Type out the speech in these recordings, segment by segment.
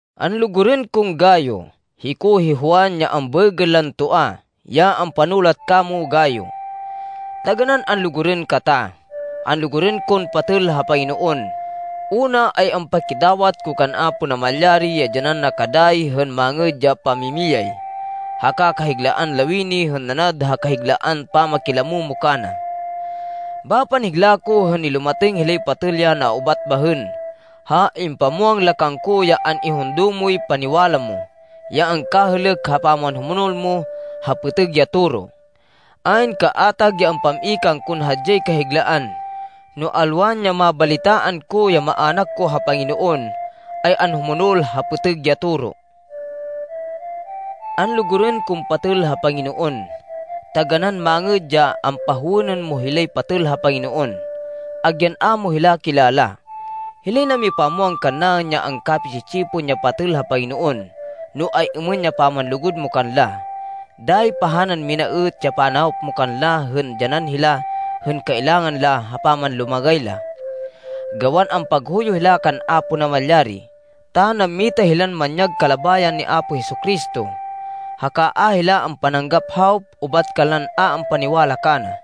Anlugurên kon Gayo, hiko hi Juan, ya ambaêgên lan Toa, ya ampanulat kamo, Gayo. Taganán anlugurên kata. Anlugurên kon patêl ha Panginoon, una ay ampakidawat ko kan Apo Namalyari, ya dyanan na ka dayi hên mangêd ya pamimiyay, haka kahiglaan lawini hên nanad ha kahiglaan pamakilamo mo kana. Bapan higla ko hên nilumatêng hilay patêl ya naubat bahên ha impamwang la kangko ya an-ihundo moy paniwala mo, ya angkahêlêk ha pamanhumonol mo ha pêtêg ya toro. Ayn kaatag ya ampam-i kangkon hadyay kahiglaan, no alwan, ya mabalitaan ko ya maának ko ha Panginoon, ay anhumonol ha pêtêg ya toro. Anlugurên kon patêl ha Panginoon, taganán mangêd ya ampahowênên mo hilay patêl ha Panginoon, agyan a mo hila kilala. Hilay namipamwang kannaên ya angkapi-tsi-tsipon ya patêl ha Panginoon, no ay-êmên ya pamanlugud mo kanla. Dayi pahanan mina êt ya panawop mo kanla hên dyanan hila hên kailangan la ha pamanlumagay la, gawan ampaghuyo hila kan Apo Namalyari, ta nammita hilan manyag kalabayan ni Apo Jesu-Cristo, haka a hila ampananggap hawop ubat kanlan a ampaniwala kana.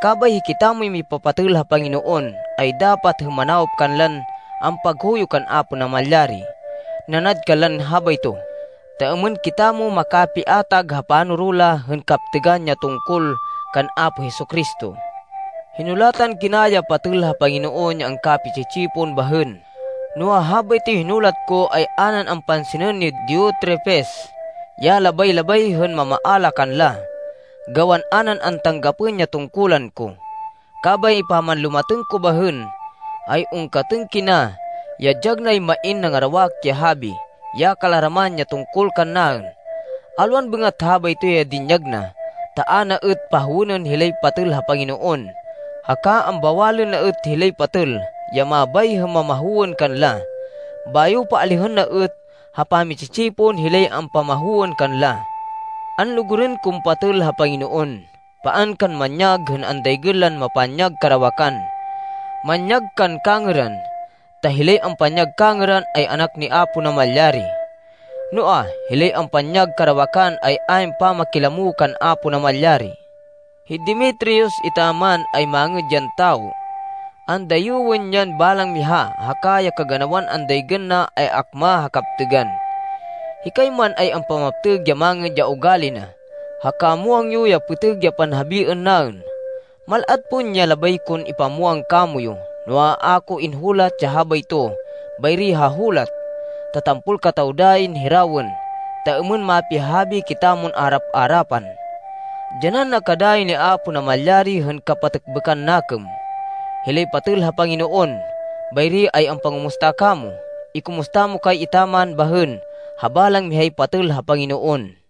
Kabay hikitamoy mipapatêl ha Panginoon, ay dapat hên manawop kanlan ampaghuyo kan Apo Namalyari nanad kanlan habayto, ta êmên kitamo makapiatag ha panoro la hên kaptêgan ya tungkol kan Apo Jesu-Cristo. Hinulatan kina ya patêl ha Panginoon ya angkapi-tsi-tsipon bahên, noa, habaytoy hinulat ko ay a nan ampansinên ni Diotrefes ya labay-labay hên mamaala kanla, gawan a nan antanggapên ya tungkulan ko. Kabay pamanlumatêng ko bahên, ay ungkatên kina ya dyag nay main nangarawak ya habi, ya kalaraman, ya tungkol kannaên. Alwan bêngat habayto ya dinyag na, ta a na êt pahowênên hilay patêl ha Panginoon, haka ambawalên na êt hilay patêl, ya mabay hên mamahowên kanla. Bayo paalihên na êt ha pami-tsi-tsipon, hilay ampamahowên kanla. Anlugurên kon patêl ha Panginoon, paan kan manyag hên andaygên lan mapanyag karawakan. Manyag kan kangêran, ta hilay ampanyag kangêran, ay anak ni Apo Namalyari. Noa, hilay ampanyag karawakan, ay ayn pamakilamo kan Apo Namalyari. Hi Demetrius etaman, ay mangêd yan tawo. Andayêwên yan balang miha, haka ya kaganawan andaygên na ay akma ha kaptêgan. Hikay man, ay ampamaptêg ya mangêd ya ugali na, haka muwang yo ya pêtêg ya panhabiên naên. Mal-at pon ya labay kon ipamwang kamoyu, noa, a ko inhulat ya habayto bayri ha hulat, ta tampol kataw dayin hirawên, ta êmên mapihahabi kitamon arap-arapan. Dyanan na ka dayi ni Apo Namalyari hên kapatêkbêkan nakêm. Hilay patêl ha Panginoon bayri ay ampangumusta kamo. Ikumusta mo kay etaman bahên ha balang mihay patêl ha Panginoon.